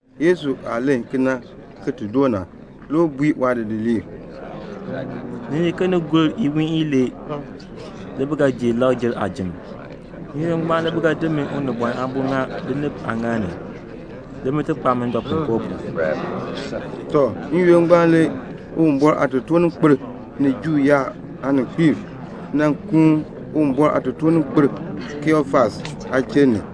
Yesu aah len kena ki ti doo na, le u bui waadidiliib, "Ni nyi ke iwiin ilee le bi ga ji Lakr-jer aajim. N-yoonn ngbaan le bi ga di min Unibɔn Aabo ki ŋa binib aaŋaal ni, le bin ti kpaa mi ndɔpuinkoo pu." Tɔ, n-yoonn ngbaan le Uwumbɔr aatotoorninkpiib ni Juu yaab aaninkpiib nan kuun Uwumbɔr aatotoorninkpil Kayafas aachiln ni,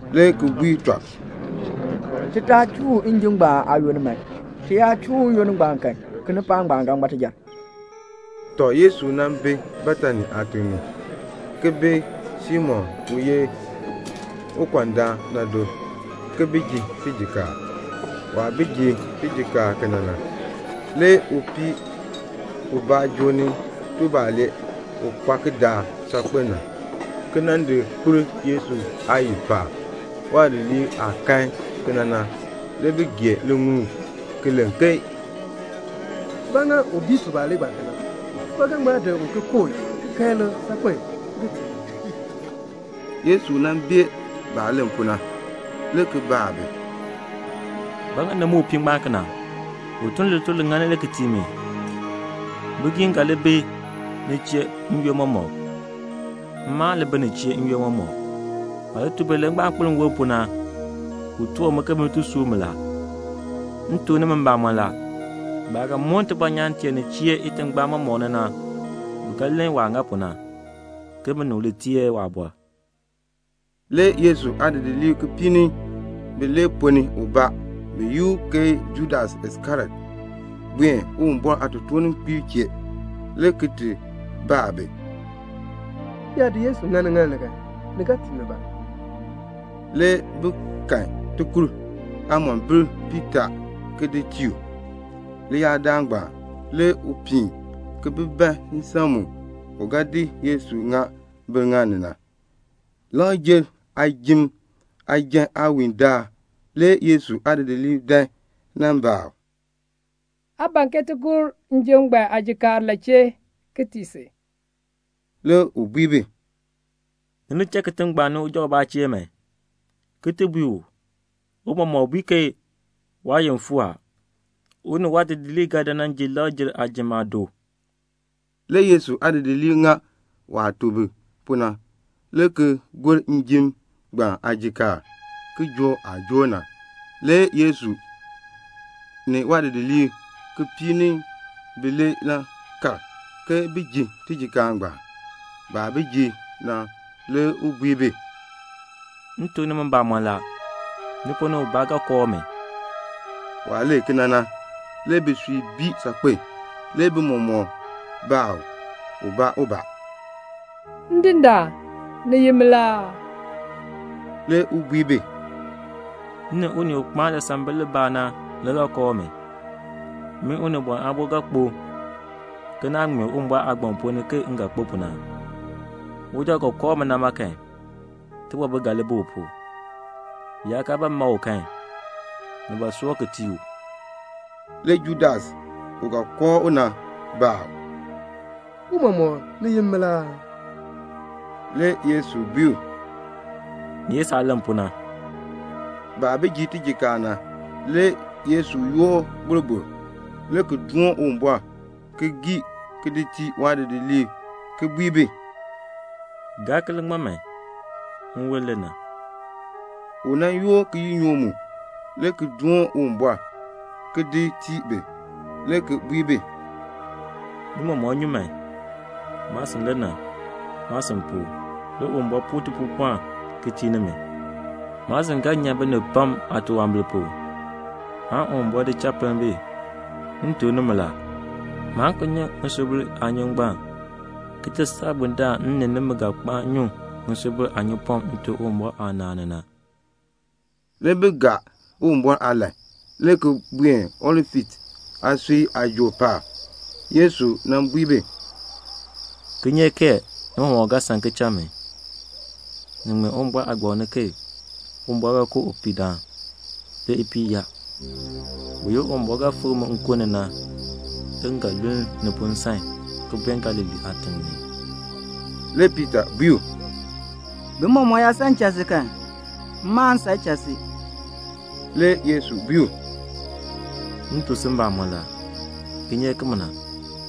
le ki bui tɔb, "Ti taa chuu u njim ngbaan aayoonn man. Ti yaa chuu u n-yoonn ngbaan kan, kinipaak ngbaan ga ŋma tijar." Tɔ, le Yesu nan bi Betani aatiŋ ni, ki bi Simon u nan ye ukɔndaan na do, ki ji tijikaar. Waah bi ji tijikaar kena na, le upii ubaa joo ni tubalee u kpa kidaak saakpen na, le ki nan di kpir Yesu aayil paab. Waadidiliib aah kan kena na, le bi gee liŋuul, le ki len, "Ba ŋa u bii tubalee ngbaan kena? Ti ba ga ŋma di u ki kooh ki kan ilik saakpen ki di tii bigiim." Le Yesu bee baah len pu na, le ki baa bi, "Ba ŋa ni muk upii ngbaan kena? U tun lituln li ŋan na le ki tii mi. Bigiim ga li bi ni chee n-yoonn mɔmɔk. Mma aan li bi ni chee n-yoonn mɔmɔk. Waah di tubalee ngbaan ki di kpir nwon pu na, u toor mi ke bin ti sub mi. M tuk nimi mbamɔn la, baah ga moon tibɔnyaan tee nin chee itingbaan mɔmɔk ni na, bi ga len waah ŋa pu na, ke binib li teer waabɔr." Le Yesu aadidiliib kipiik ni bilee ponn ni ubaa, bi yi u ke Judas Iskariot, buen Uwumbɔr aatotoorninkpiib chee, le ki baa bi, "M yaa di Yesu di ŋa niŋaal ni kan, ni ga tii mi ba?" Le bi kahn ŋimombil aakur piitaa le ki di tii u. Leyaadaal ngbaan le u piin ki bi ban nsan mu u ga di Yesu ki di ŋa biŋaal ni na. Lakr-jer aajim njan aawiindaal le Yesu aadidiliib dan nan baa u, "Aa ban ke ti gor njim ngbaan aajikaar la chee ki tii si?" Le u bui bi, "Ni li cha kitiŋ ngbaan ni man uja ubaa chee, ki ti bui u, 'Tiicha bui ke waayoonn fuu a. U ni waadidiliib ga dan nan ji Lakr-jer aajim aado."' Le Yesu aadidiliib ŋa waah tuk bi pu na, le ki gor njim ngbaan aajikaar. Kijook aah joor na, le Yesu ni waadidiliib kipiik ni bilee nan kal ke bin ji tijikaar ngbaan. Baah bi ji na, le u bui bi, "M tuk nimi mbamɔn la, ni ponn ni ubaa ga kooh mi." Waah len kena na le bisui bii saakpen a. Le bi mɔmɔk baa u ubaabaa ubaabaa, "Ndindaan, ni ye min la aa?" Le u bui bi, "M ni unii u kpaan lisambil libaa na le ga kooh mi. Min Unibɔn Aabo ga kpo ke naah ŋmee Uwumbɔr Aagbaŋ ponn ni ke m ga kpo pu na. Uja u ga kooh mi na ma kan, tibɔbil ga li bi u pu; bi yaa kaa ba ma u kan, ni ba soor ki tii u." Le Judas, u ga kooh u na, baa u, "Tiicha, ni ye min la aa?" Le Yesu bui u, "Ni ye saah len pu na." Baah bi ji tijikaar na, le Yesu yoor boroboro, le ki doon Uwumbɔr, le ki gii, ki di tii waadidiliib, ki bui bi, "Gaa ki li ŋma man. Nwon le na." Le u yoor kiyinyook, le ki doon Uwumbɔr, le ki di tii bi, le ki bui bi, "Ni mɔmɔk nyu man. Maasin le na. Maasin pu, le Uwumbɔr puu tipuupɔln ki tii nimi. Maasin ga nyan binib pam aatunwambir pu, aan Uwumbɔr di cha pinn bi. M tuk nimi la, maan ki nyu ŋisubil aanyun ngbaan, ki ti saa bundaln m ni nimi ga kpaan nyu ŋisubil aanyunpɔm Nte Uwumbɔr aanaan ni na." Le bi gaa Uwumbɔr aalahn, le ki buen Olif aasui aajool paab. Le Yesu bui bi, "Kinyeek kee ni mɔmɔk ga san ki cha mi. Ni ŋmee Uwumbɔr Aagbaŋ ni ke 'Uwumbɔr ga ku upihdaan, le ipiih yaa.' Buyoonn Uwumbɔr ga fikr mi nkun ni na, le m ga luln ni pu nsan ki buen Galilee aatiŋ ni." Le Piita bui u, "Bi mɔmɔk yaa san ki cha si kan, mma aan san ki cha si." Le Yesu bui u, "M tuk si mbamɔn la, kinyeek kimina,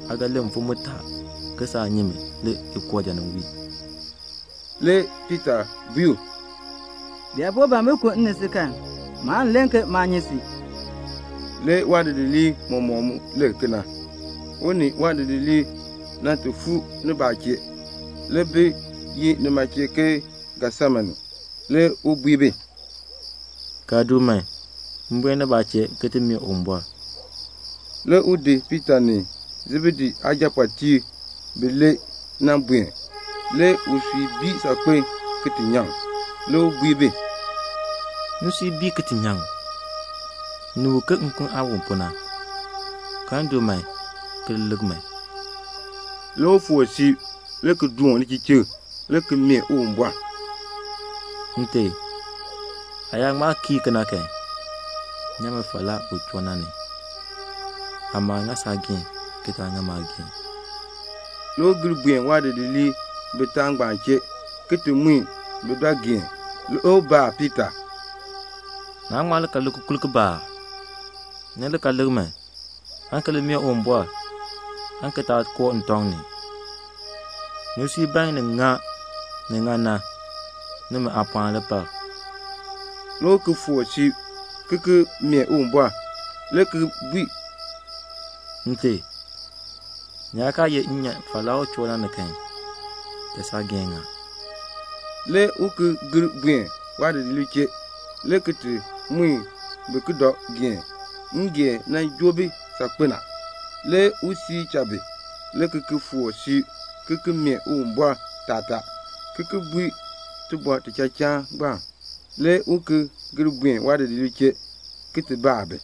aa ga len mfim mutaa ke saa nyi mi le ukooja nin wii." Le Piita bui u, "Bi yaa po ban bin ku m ni si kan, maan len ke maa nyi si." Le waadidiliib mɔmɔk mu len kena. Le u ni waadidiliib fuu nibaa chee, le bi yi nima chee Getsemane. Le u bui bi, "Kaln du man, m buen nibaa chee ki ti mee Uwumbɔr." Le u di Piita ni Sebedee aajapɔɔtiib bilee, ki di buen. Le usui bii saakpen ki ti nyaŋ. Le u bui bi, "Nsui bii ki ti nyaŋ. Ni wu ke nkun aah wu pu na. Kaln du man, ki li lik man." Le u foor siib, le ki doon lichichikr, le ki mee Uwumbɔr, "Nte, aa yaa ŋma kii kena kan, nyan mi falaa u choo na ni. Amaa ŋa saageehn, ki taa ŋa maageehn." Le u gir buen waadidiliib bitaa ngbaan chee, le ki ti mui bi dɔ geen, le ki baa Piita, "Naa ŋma kal lik kikurk kibaa aa? Ni li ka lik man, aan ki li mee Uwumbɔr, aan ki taa koo ntɔŋ ni. Nisui ban ni ŋa ni ŋan na. Nimi aapɔɔn le par." Le u ki foor siib, ki mee Uwumbɔr, le ki bui, "Nte, ni yaa kaa ye m nyan falaa u choo na ni kan, cha saageehn ŋa." Le u ki gir buen waadidiliib chee, le ki ti mui bi ki dɔ geen; ngeen joo bi saakpen a. Le u cha bi, le ki ki foor siib, le ki mee Uwumbɔr taatar, ki ki bui u tibɔr tichachaan ngbaan. Le u ki gir buen waadidiliib chee, le ki baa bi,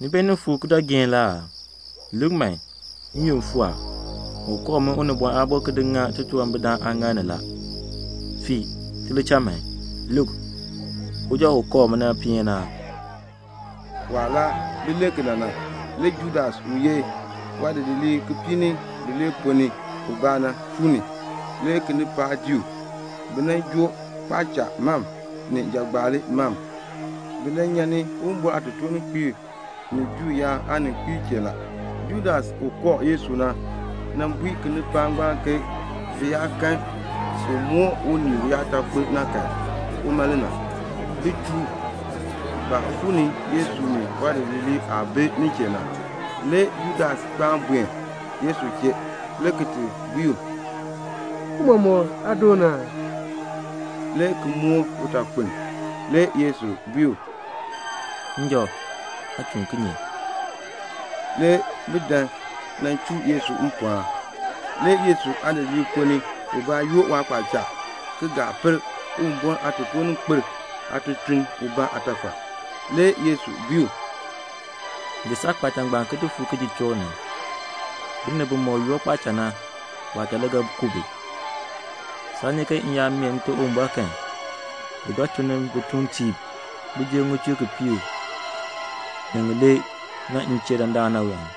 "Ni beenin fuur ki dɔ geen la aa? Lik, n-yoonn fuu a. U kooh min Unibɔn Aabo ki di ŋa titunwambirdam aaŋaal ni la. Fiin, ti li cha man. Lik, uja u kooh mi na peeni a." Waah laa bi len kena na, le Judas u ye waadidiliib kipiik ni bilee ponn ni ubaa na, fuu ni a. Le kinipaak dii u. Bi joo kpaacha mam ni jagbaali mam. Bi nyan ni Uwumbɔr aatotoorninkpiib ni Juu yaab aaninkpiib chee la. Judas u kooh Yesu na, nan bui kinipaak ngbaan ke bi yaa ti kan u moor unii uyaatakpiln na kan, uma le na. Bin chuu u. Baah fuu ni Yesu ni waadidiliib aah bi nin chee na, le Judas kpaan buen Yesu chee, le ki bui u, "Tiicha, aa doon aa?" le ki moor utakpiln. Le Yesu bui u, "Njɔ, aa chuun kinye?" Le bi dan nan chuu Yesu mpɔɔn. Le Yesu aadidiliib ponn ni ubaa yoor waakpaacha ki gii nyan Uwumbɔr aatotoorninkpil aatutuln aatafal. Le Yesu bui u, "Di saakpaacha ngbaan ki di fu kijuchook ni. Binib bimɔk yoor kpaacha na, kpaacha le ga ku bi. Saa nyi ke m yaa mee Nte Uwumbɔr kan, u ga tun ni bituuntiib jer ŋichur kipiik ni ŋilee na m chee dandana aa?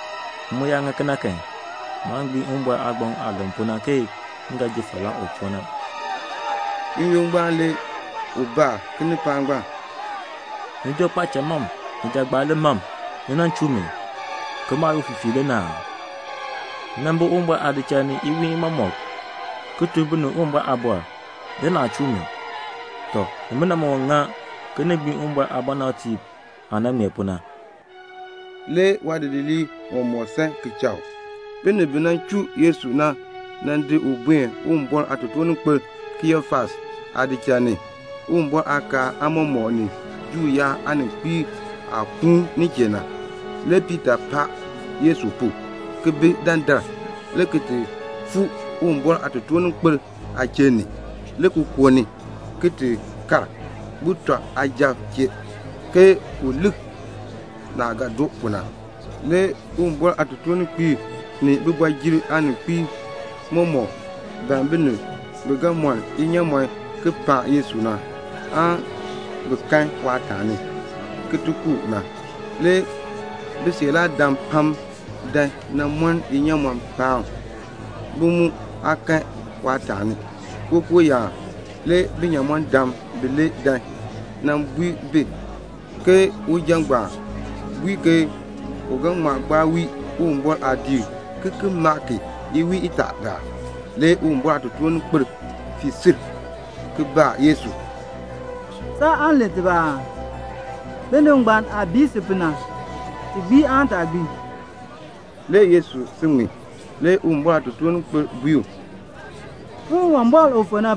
M mu yaa ŋa kena kan, maan gbiin Uwumbɔr aagbaŋ aah len pu na ke m ga ji falaa u choo na." N-yoonn ngbaan le u baa kinipaak ngbaan, "Ni joo kpaacha mam ni jagbaali mam, ni nan chuu mi, ke maah ye ufifiir le na aa? Iwiin mɔmɔk m nan bi Uwumbɔr aadichal ni, ki tuk binib Uwumbɔr aaliin, le naa chuu mi. Tɔ, nimina mɔmɔk ŋa ke ni gbiin Uwumbɔr aabɔnabtiib aah nan ŋmee pu na." Le waadidiliib mɔmɔk san ki cha u. Le binib bi chuu Yesu na, bi di u ki di buen Uwumbɔr aatotoorninkpil Kayafas aadichal ni, Uwumbɔr aakaal aamɔmɔkb ni Juu yaab aaninkpiib aah kuun nin chee na. Le Piita paan Yesu pu, ki bi dandar, le ki ti fuu Uwumbɔr aatotoorninkpil aachiln ni, le ki koo ni, le ki ti kal sujatiib chee, ke un lik naah ga doo pu na. Le Uwumbɔr aatotoorninkpiib ni kooti ni aaninkpiib mɔmɔk ban binib bi ga mɔn inyaamɔn ki paan Yesu na, aan bi kan waataani, ki ti ku u na. Le bisiiraadam pam dan nan mɔn inyaamɔn paan u. Bi mu aa kan waataani. Kookooyaan le binyamɔndam bilee dan nan bui bi ke uja ngbaan bui ke u ga ŋma gbaa wii Uwumbɔr aadiik, ki ki maa ki iwiin itaa. Le Uwumbɔr aatotoorninkpil fii sil, ki baa Yesu, "Saan len tibaa aa? Binib ngbaan aah bii si pu na, ti gbii aan taa gbii?" Le Yesu si ŋmin. Le Uwumbɔr aatotoorninkpil bui u, "Puun Uwumbɔr u fu na,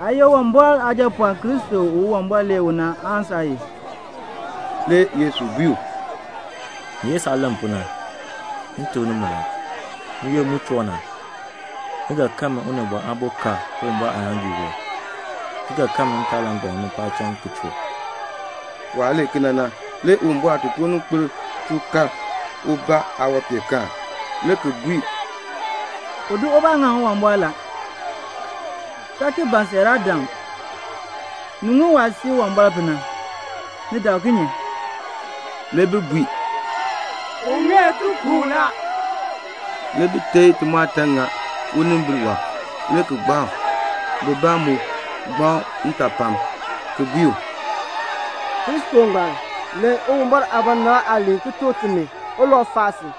aa ye Uwumbɔr Aajapɔɔn Kristo u Uwumbɔr lee u na aan saa ye?" Le Yesu bui u, "Ni ye saah len pu na. M tuk nimi la, n-yoonn mu choo na, ni ga kan min Unibɔn Aabo ka Uwumbɔr aaŋaaŋgii wɔb, ki ga kan mi ntaalangbam ni paacham ki choo." Waah len kena na, le Uwumbɔr aatotoorninkpil chuu kar ubaa aawanpeenkaan, le ki bui, "U di ubaa ŋaŋ Uwumbɔr la. Taa ki ban siiraadam. Ni ŋun waah sii Uwumbɔr pu na. Ni dak kinye?" Le bi bui, "U ŋeer ti ku u la." Le bi teei timɔɔtan ŋa unimbil wɔb, le ki gbaa u. Bibaa mu gbaa u ntaapalm, ki bui u, "Kristo ngbaan, lem Uwumbɔr aabɔnabr aaliin ki tuk timi ulau faa si." Le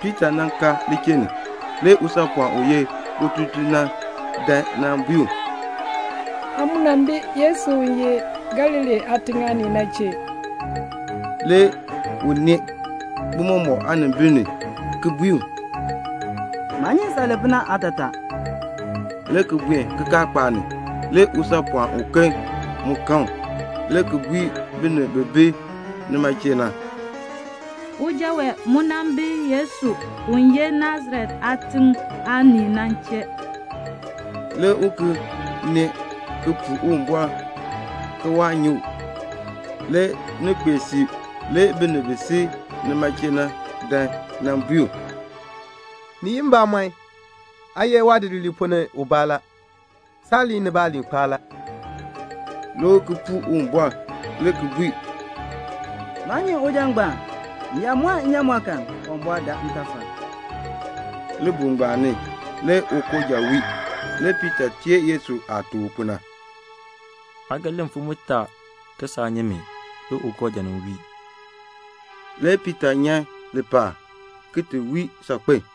Piita ka lichiln ni. Le usaapɔɔn ututuln na dan nan bui u, "Aa mu nan bi Yesu u ye Galilee aatiŋ aanii na chee." Le u nee bi mɔmɔk aanimbil ni le ki bui u, "Maa nyi saah len pu na aatataa," le ki buen kikaakpaak ni. Le usaapɔɔn uken kan u, le ki bui binib bi bi nima chee na, "Uja wee mu nan bi Yesu u ye Nasaret aatiŋ aanii na chee." Le u ki nee ki puu Uwumbɔr ke waa nyi u. Le ni kpee siib, le binib bi si nima chee na dan nan bui u, "Ni ye mbamɔn, aa ye waadidiliib ponn ni ubaa la; saaliin ni baaliin kpaan la." Le u ki puu Uwumbɔr, le ki bui, "Maa nyi uja ngbaan. M yaa mɔn nnyaamɔn kan, Uwumbɔr daa ntafal." Libuul ngbaan ni le ukooja wii. Le Piita teer Yesu aah tuk u pu na, "Aa ga len mfim mutaa ke saa nyi mi, le ukooja nin wii." Le Piita nyan lipaal, le ki wii saakpen.